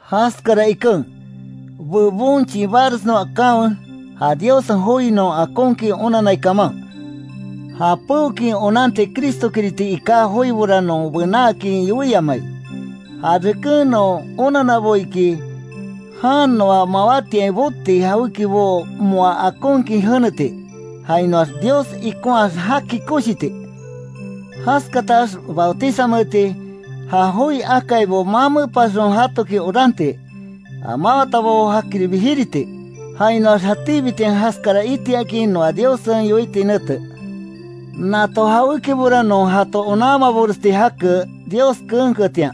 Jaskara iken, bebon chibanresnon akanwe, ja Diossen joi non akonkin onannai kaman. Ja peokin onanti Cristo kiriti iká joibora non benaakin yoiamai. Ja reken non onannabo iki, jan noa mawátiain boti jawékibo moa akonkin jeneti, jainoax Dios ikonhaax jaki koshiti, jaskatax bautizameti; ja joi akaibo mamepasxon jatoki oranti; ja mawatabo jakiribi jiriti; jainoax jatíbitian jaskara itiakin noa Diossen yoiti nete. Nato jawékibora non jato onanmaboresti jake, Dios keenketian.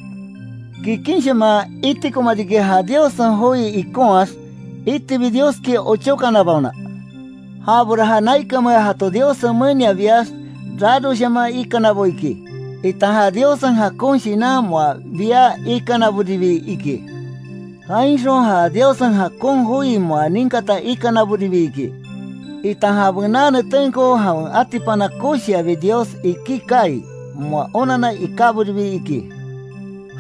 Kikinshaman itikoma riki, ja Diossen joi ikonhaax iitibi, Dioski ochókanabaona. Jabora ja naikanmea jato Diossen menia biax, raroshaman ikanabo iki, itan ja Diossen jakon Shinan moa bia ikanaboribi iki, jainxon ja Diossen jakon joi moa ninkata ikanaboribi iki, itan ja bená netenko jawen atipana koshiabi Dios iki kaai, moa onanna ikáboribi iki.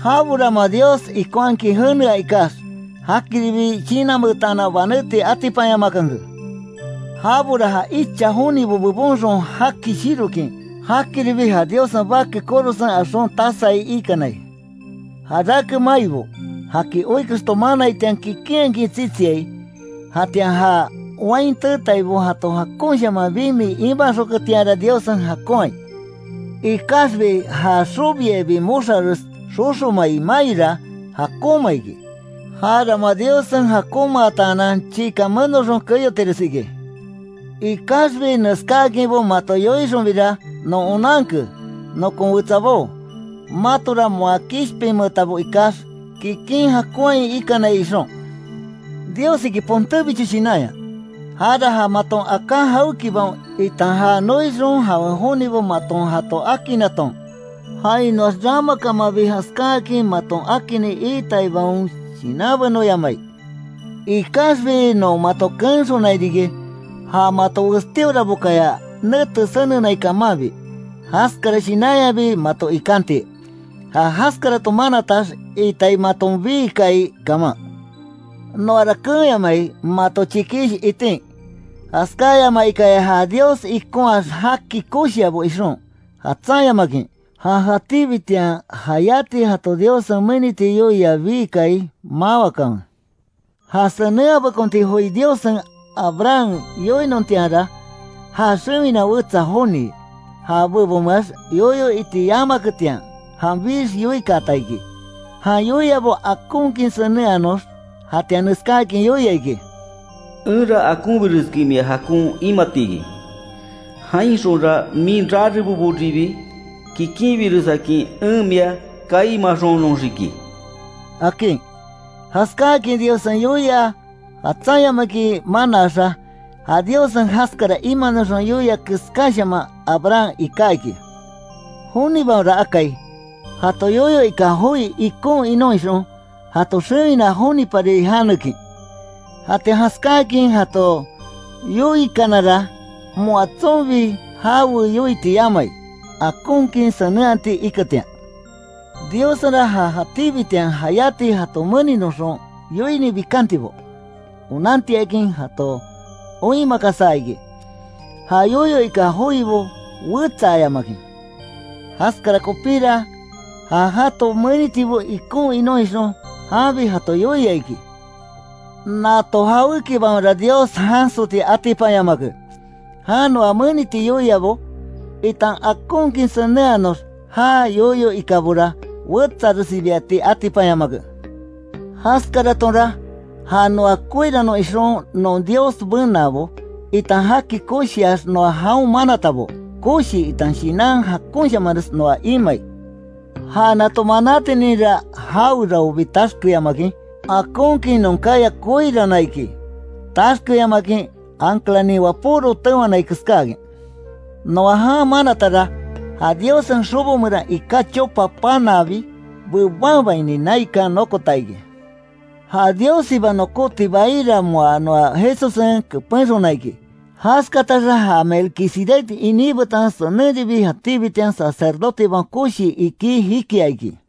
Jabora moa Dios ikonhakin jenea ikax, jakiribi shinanmeetanan, banéti atipanyamakanke. Jabora ja icha jonibo bebonxon jaki shirokin, jakiribi ja Diossen Bake korosen axon tasai iikanai. Jarake maibo, jaki oi kexto manaitian, kikinhakin tsitsiai, jatian ja wain teetaibo jato jakonshaman bimi imaxonketianra, Diossen jakonhai, ikaxbi ja xobiabi moxares xoxomai maira, jakonma iki. Jara moa Diossen jakonmataanan, chiikan menoxon keyotires iki. Ikaxbi neskáakinbo mato yoixonbira, non onanke, nokon wetsabó, matora moa kishpinmeetabo ikax, kikin jakonhain ikanai ixon. Dios iki pontébicho shinanya, jara ja maton aká jawékibaon, itan já noixon jawen jonibo maton jato akinnaton jainoax ramakamanbi jaskáakin maton akinni iitaibaon shinanbenoyamai. Ikaxbi non mato keenxonai riki, ja mato westíorabokaya, nete senenai kamanbi, jaskara shinanyabi mato ikanti, ja jaskaraton manatax itai maton bii kaai kaman, Noara keenyamai, mato chikish itin, jaskáyamaikaya ja Dios ikonhaax jaki koshiabo ixon, jatsanyamakin, ja jatíbitian jayáti jato Diossen meniti yoia bii kaai, mawakanwe. Ja senenhabekonti joi Diossen Abraham yoinontianra, já xewina wetsa joni, ja bebonmeax yoyo iti yamaketian, janbix yoikaata iki, jan yoiabo akonkin senenhanox. Jatian neskáakin yoia iki: “Enra akonbireskin mia jakon imati iki, jainxonra min rareboboribi kikinbiresakin en mia kaimaxonoxiki”, akin. Jaskáakin Diossen yoia jatsanyamakin manaaxa, ja Diossen jaskara imanoxon yoia keskáshaman, Abraham iká iki. Jonibaonra akai, jato yoyo ika joi ikon inon ixon, jato xewina jonipari janekin, jatian jaskáakin jato yoiakanara, moa tsonbi jawe yoiti yamai, akonkin senenhati iketian. Diossenra, ja jatíbitian jayáti jato meninoxon yoini bikantibo, onantiakin jato oinmakasa iki, já yoyo ika joibo wetsaayamakin. Jaskara kopira, ja jato menitibo ikon inon ixon, janbi jato yoia iki. Nato jawékibaonra Dios jansoti atipanyamake, jan noa meniti yoiabo, itan akonkin senenhanox já yoyo ikabora wetsaressibiati atipanyamake, jaskaratonra ja noa koirannon ixon non Dios benaabo, itan jaki koshiax noa jaon manatabo, koshi itan shinan jakonshamanres noa imai. Ja nato manátininra jaoraobi taxkemayamakin, akonkin non kaya koiranna iki, taxkemayamakin anclanin wapóro tewanai keskáakin. Noa jan manatara, ja Diossen xobo meran iká chopa panaabi bebanbaini, naikan nokota iki, ja Diossiba nokóti baira moa noa Jesussen kepenxona iki. Jaskataxa, ja Melquisedec iní betan senenribi, jatíbitian Sacerdotebaon Koshi iki jikia iki.